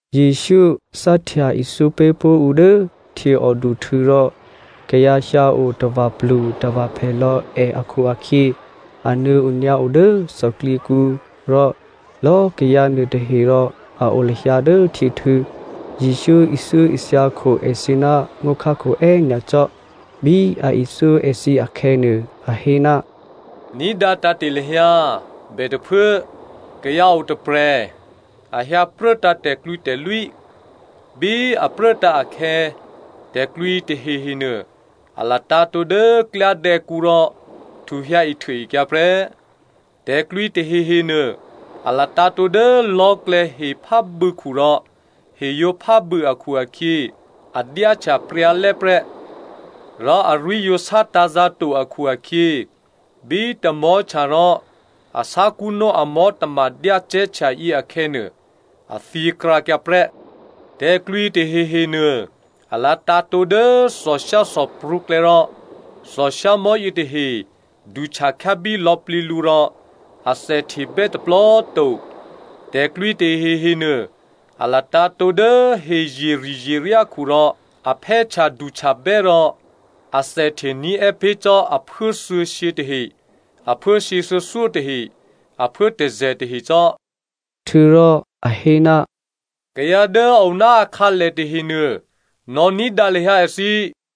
Jesǔ cáhtya ithyó pé̤pó̤ ǔ dố htyěòduhtû̌ rò kayǎ hyǎo tava̤plutava̤phè lò̌ è akhu-akhyě a nuô̌ onyǎ o dố thòklyěkǔ rò lò̌꤮ kayǎ nuôtahe rò a o lahyǎ dố htyěhtû̌. Jesǔ ithyóithya kho èthǐ ná ngó̤khákho è́nyacò́. Bí a ithyó èthǐ akhè̌nuô, a hé, “Ní̤dǎ tǎ̤te̤ lahyǎ! Bètôphuố, kayǎ o tôprè̤, a hyǎpruốtǎ̤ tè̤klwǐtè̤lwí. Bí a pruốtǎ̤ akhè̌, tè̤klwǐ tahehenuô, a latǎ̤tǒ dố klyádè̌kǔ rò htu hyǎihtuôekyǎ prè́. Tè̤klwǐ tahehenuô a latǎ̤tǒ dố lò̤́klè̌ hephábû̌khu rò he yǒ phábû̌ akhu-akhyě, a dyáhtya pryǎlè́prè́, rò arwí̤ yǒ sátǎ̤zǎ̤ to akhu-akhyě, bí tamò̤́htya rò a sákṳ́nó amò̤́ tamadyácè̤́ htyayě akhè̌nuô, a thyěkrǎkyǎ prè́. Tè̤klwǐ tahehenuô a latǎ̤tǒ dố thòshyáthòprǔklè̌ rò thòshyámò̤́ yětahe duhtya khyábí lò̌plǐ lǔ rò athèhtebè́ tôplò꤮ to. Tè̤klwǐ tahehenuô a latǎ̤tǒ dố hezyeri̤zyeryákhu rò a phè́htyaduhtyabè́ rò athèhte ní̤è́ pé̤ cò́ aphuố thuô̌shyě tahe, aphuố shyěthuô̌thyó tahe, aphuố tôzè̤ tahe cò́.” Htuô̌rò a hé, “Kayǎ dố a o ná akhǎlè tahenuô, nò̌ ní̤dǎ lahyǎ èthǐ.”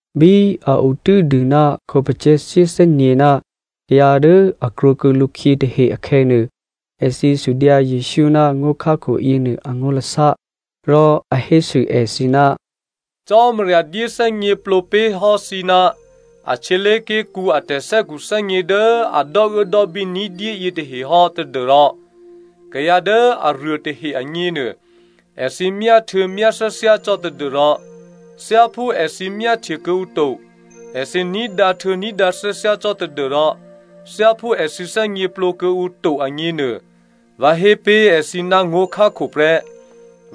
Bí a o tû́dû ná a khǒpacè̤̌ shyéthè́nyě̤ ná kayǎ dố a krwǒkuô̌ lǔkhyě tahe akhè̌nuô, èthǐ sudyǎ Jesǔ ná ngó̤khákho yěnuô angó̤lasá. Rò a hésû èthǐ, “Cò́marya dyéthè́gněplǒ pé̤hò́ thǐ ná a htyělé̤ké̤kǔ a tè̤thè́khuthè́gně dố a dò́uốdò́bí ní̤dyé yětahe hò́ tadû́rò kayǎ dố aruô tahe agněnuô, ‘Èthǐ myá htuô̌ myá thyáthyá cò́ tadû́rò thyáphú èthǐ myáhtye kuô̌ǔ to, èthǐ ní̤dǎ htuô̌ ní̤dǎ thyáthyá cò́ tadû́rò thyáphú èthǐ thè́gněplǒ kuô̌ǔ to,’ agněnuô, vǎ hé pé̤ èthǐ ná ngó̤khákho prè́.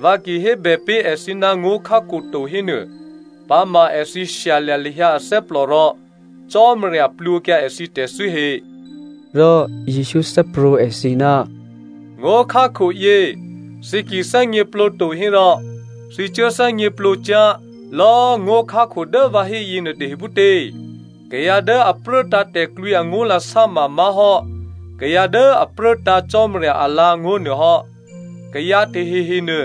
Vǎ ki hébè pé̤ èthǐ ná ngó̤khákho to hénuô, ‘Pǎma èthǐ shyalya̤ lahyǎ athè́plò rò Cò́marya plwǒkyǎ èthǐ tè̤thû́ he.’” Rò Jesǔ thè́prwǒ̤ èthǐ, “Ngó̤khákhoyě, thǐ ki thè́gněplǒ to hérò, thǐ cuố thè́gněplǒ cyá̤ lò̌꤮ ngó̤khákho dố vǎ hé yěnuô tahe phútě? Kayǎ dố a pruốtǎ̤ tè̤klwǐ angó̤lasá mamá̤hò́ kayǎ dố a pruốtǎ̤ Cò́marya alǎ̤angó̤ nuô hò́. Kayǎ tahehenuô,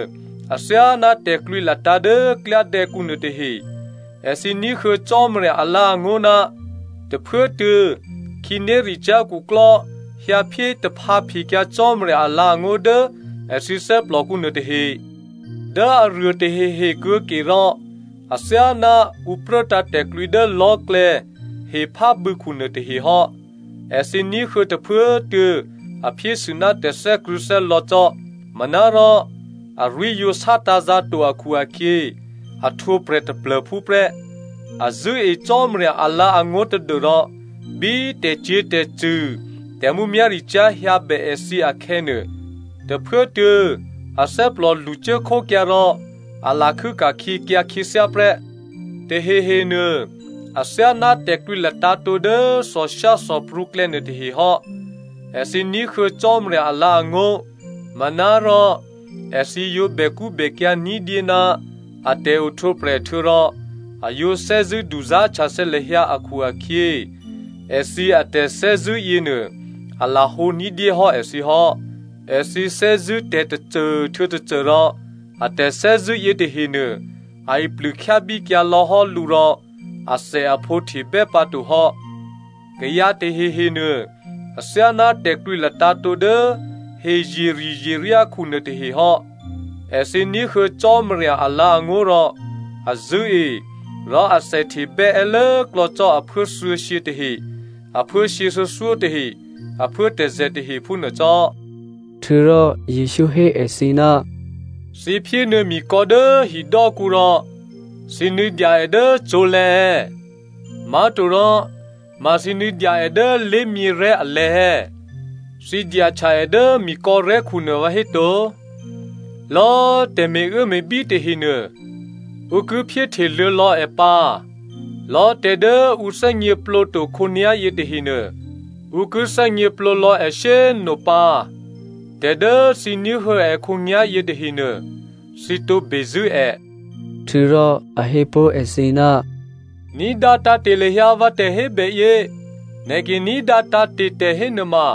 athyáná tè̤klwǐ latǎ̤ dố klyádè̌kǔ nuôtahe, èthǐ ní̤huô̌ Cò́marya alǎ̤angó̤ ná tôphuốtuô̌ khǐnéricyá̤ khuklò́ hyǎphyé taphǎphekyǎ Cò́marya alǎ̤angó̤ dố èthǐ thè́plòkǔ nuôtahe. Dố aruô tahehe kuô̌ke rò athyáná ǔ pruốtǎ̤ tè̤klwǐ dố lò̤́klè̌ hephábû̌khu nuôtahehò́. Èthǐ ní̤huô̌ tôphuốtuô̌ a phyésû ná tè̤thè́krṳ̂̌thè́lò̌ cò́. Manárò arwí̤ yǒ sátǎ̤zǎ̤ to akhu-akhyě, a htwǒprè̤ taplô̤phú prè́. A zṳ̂́e Cò́marya alǎ̤angó̤ tadû́rò bí tè̤cyě̤tè̤cṳ̂ tè̤mǔmyá̤ricyá̤ hyǎ bè èthǐ akhè̌nuô, tôphuốtuô̌ athè́plò lṳcuốkhókyǎ rò a lakhû́ ka̤khyěkyǎ khyěthyá prè́. Tahehenuô athyáná tè̤klwǐ latǎ̤tǒ dố thòshyáthòprǔklè̌ nuôtahe hò́. Èthǐ ní̤huô̌ Cò́marya alǎ̤ngó̤ manárò èthǐ yǒ bèkṳ́bèkyǎ̤ ní̤dyé ná a tè̤ohtwǒprè̤ htuô̌rò a yǒ thè́zṳ̂́ duzá̤htyathè̌ lahyǎ akhu-akhyě, èthǐ atè̤thè́zṳ̂́ yěnuô a lahǒ ní̤dyéhò́ èthǐ hò́. Èthǐ thè́zṳ̂́ tè̤tôcô htuô̌ tôcô rò a tè̤thè́zṳ̂́ yětahenuô a iplûkhyábíkyǎ lò̌hò́ lǔ rò athèaphǒ htebè́ pǎtohò́. Kayǎ tahehenuô athyáná tè̤klwǐ latǎ̤tǒ dố hezyeri̤zyeryákhu nuôtahehò́. Èthǐ ní̤huô̌ Cò́marya alǎ̤angó̤ rò a zṳ̂́e rò athèhtebè́ è́ lốklò̌ cò́ aphuố thuô̌shyě tahe aphuố shyěthuô̌thyó tahe, aphuố tôzè̤ tahe phúnuô cò́.” Htuô̌rò Jesǔ hé èthǐ, “Thǐ phyénuô̌ mikò̌ dố hidò́kǔ rò thǐ nuô̌dya è dố cǒ̤lè̤̌ è̌? Má̤torò ma thǐ nuô̌dya è dố lé̤myěrè̤́ alè̤̌ è̌? Thǐ dyahtya è dố mikò̌rè̤́khunuô vǎhéto? Lò̌꤮ tè̤ me̤uốme̤bí tahenuô, ǔ ki phyéhteluô̌ lò̌ è pǎ. Lò̌꤮ tè̤ dố ǔ thè́gněplǒ to khǒnyá̤yě tahenuô, ǔ ki thè́gněplǒ lò̌ è shyé꤮ nopǎ. Tè̤ dố thǐ ní̤huô̌ è khǒnyá̤ yětahenuô thǐ tǒ bezṳ̂́ è.” Htuô̌rò a hé pó̤ èthǐ, “Ní̤dǎ tǎ̤te̤ lahyǎ vǎ tè̤hébèyě. Nè̤ ki ní̤dǎ tǎ̤te̤ tè̤ hénuôma,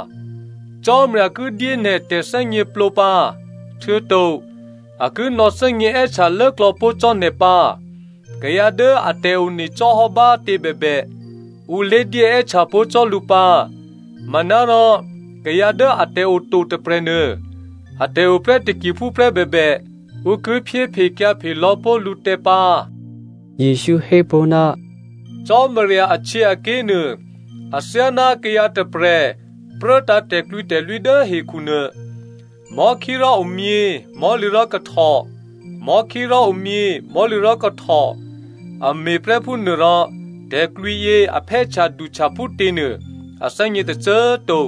Cò́marya ki dyé nè̤ tè̤thè́gněplǒ pǎ, htuô̌to a ki nò̌thè́gně è́htya lốklò̌ pó̤ cò́ nè̤ pǎ. Kayǎ dố atè̤one cò́hò́ bá꤮ tě bèbè, ǔ lédyé è́htya pé̤pó̤ cò́ lǔ pǎ, manárò kayǎ dố atè̤ o to tôprè̤nuô, atè̤ oprè́ takiphúprè́ bèbè, ǔ ki phyéphekyǎphe lò̌ pó̤ lǔtè̤ pǎ.” Jesǔ hé pó̤, “Cò́marya ahtyěaké̤nuô athyáná kayǎ tôprè̤ pruốtǎ̤ tè̤klwǐtè̤lwí dố hekhu nuô. Mò̤́khí rò omyě, mò̤́lǐ rò kahtò, mò̤́khí rò omyě, mò̤́lǐ rò kahtò, a me̤ prè́ phúnuô rò tè̤klwǐyě a phè́htya duhtya phútěnuô a thè́gně tôcô꤮ to.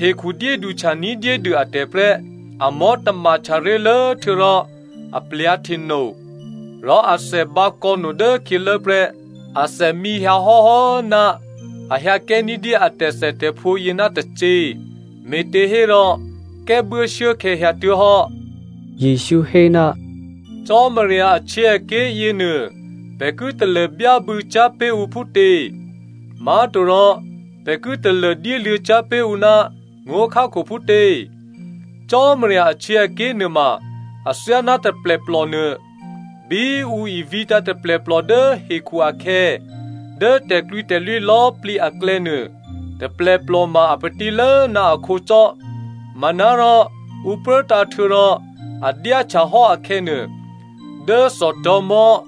Hekhu dyéduhtya ní̤dyédû atè̤ prè́. Amò̤́ tamahtya ré̤lố htuô̌rò aplyǎ̤ hteno, rò athè bǎkò̌no dố khyělố prè́. Athè mǐ hyǎ hò́hò́ná a hyǎ kè́ ní̤dyé atè̤thètè̤phǒ yě ná tacě, me̤těhérò kè́buố shuốkhè̌ hyǎtuố̤hò́.” Jesǔ hé, “Cò́marya ahtyěaké̤ yěnuô pè̤ ki talô byábû̌ cyá̤ pé̤ ǔ phútě? Má̤torò pè̤ ki talô dyéluô̌ cyá̤ pé̤ ǔ ná ngó̤khákho phútě? Cò́marya ahtyěaké̤ nuôma athyáná taplèplò nuô. Bí ǔ ivǐtǎ̤ taplèplò dố hekhu akhè̌, dố tè̤klwǐtè̤lwí lò̌꤮ plǐ aklè̌nuô taplèplò ma a patílố ná akhǒ cò́. Manárò ǔ pruốtǎ̤ htuô̌rò a dyáhtya hò́ akhè̌nuô, dố thòtò̤̌mò̤́,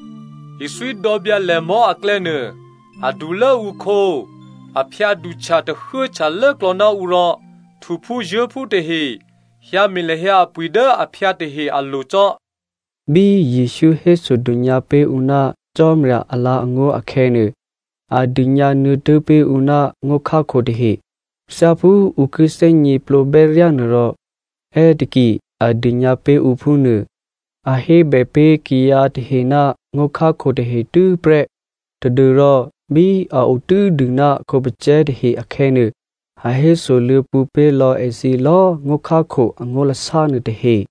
ithwídò̌byǎlèmò̤́ aklè̌nuô adulố ǔkhǒ, a phyǎduhtya tahuốhtya lốklò̌ná ǔ rò htuphúzuố̤phú tahe hyǎme̤ lahyǎ apwi̤ dố aphyǎ tahe alo̤ cò́.” Bí Jesǔ hésodônyǎ pé̤ ǔ ná Cò́marya alǎ̤angó̤ akhè̌nuô, a dônyǎ nuô̌tố̤ pé̤ ǔ ná ngó̤khákho tahe. Thyáphú ǔ ki thè́gněplǒbè́ ryá nuôrò è́taki a dônyǎ pé̤ ǔ phúnuô. A hébè pé̤ kayǎ tahe ná ngó̤khákho tahe tû́prè́ tadû́rò bí a o tû́dû ná a khǒpacè̤̌ tahe akhè̌nuô, a hésoluô̌ pwǒ̤ pé̤ lò̌ èthǐ lò̌꤮ ngó̤khákho angó̤lasá nuô tahe.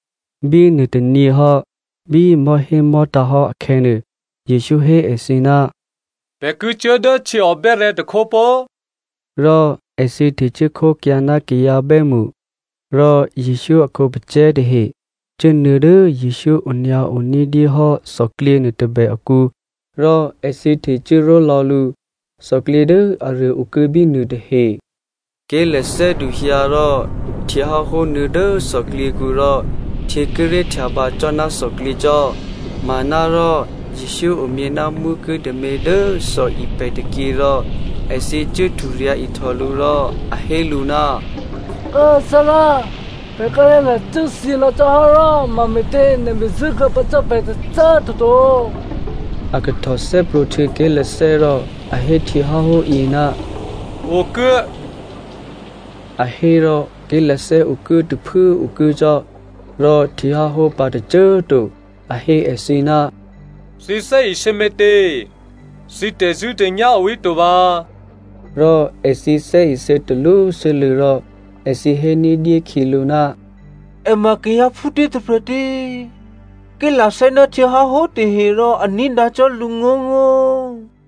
Bí nuôtônyě hò́, bí mò̤́hémò̤́tǎ̤ hò́ akhè̌nuô, Jesǔ hé èthǐ, “Pè̤ ki cuố dố htyěò bè́rè̤̌ tôkhó pó꤮.” Rò èthǐ htecuố khókyǎ ná kayǎ bè́mṳ. Rò Jesǔ a khǒpacè̤̌ tahe cuốnuô̌ dố Jesǔ onyǎo ní̤dyé hò́ thòklyě nuôtôbè akǔ rò èthǐ htecuốró̤ lò̌ lǔ. Thòklyě dố aruô okuô̌ bínuô tahe. Ké̤lathè́ duhyǎ rò htyěháhó nuô̌ dố thòklyěkǔ rò htyě kíré̤ htyabǎ cò́ ná thòklyě cò́. Manárò Jesǔ omyě ná mwókuố̤ tômě dố thòipè̤ tôkyě rò èthǐ cuố hturyǎ̤ ihtò lǔ rò a hé lǔ, “Kố꤮ Thárá, pè̤ kíré̤ lacû́thyě lò̌ cò́hò́ rò mame̤tě nè̤ bezṳ̂́ kuô̌ pǎ cò́ pè̤ tôcô꤮ toto?” A kahtò thè́prwǒ̤htuô̌ ké̤lathè́ rò a hé htyěháhóyě, “okuố!” A hé rò ké̤lathè́ okuốtôphuố okuố cò́ rò htyěháhó pǎ tôcô꤮ to. A hé èthǐ, “Thǐ thè́isě me̤tě? Thǐ tè̤zṳ̂́tè̤nyá̤ o híto vǎ?” Rò èthǐ thè́isě talwósû́lû̌ rò èthǐ hé ní̤dyé khyělǔ, “È ma kayǎ phútě tôprè̤ tě? Ké̤lathè́ ná htyěháhó tahe rò a ní̤dǎ cò́ lǔngó̤ngó̤.”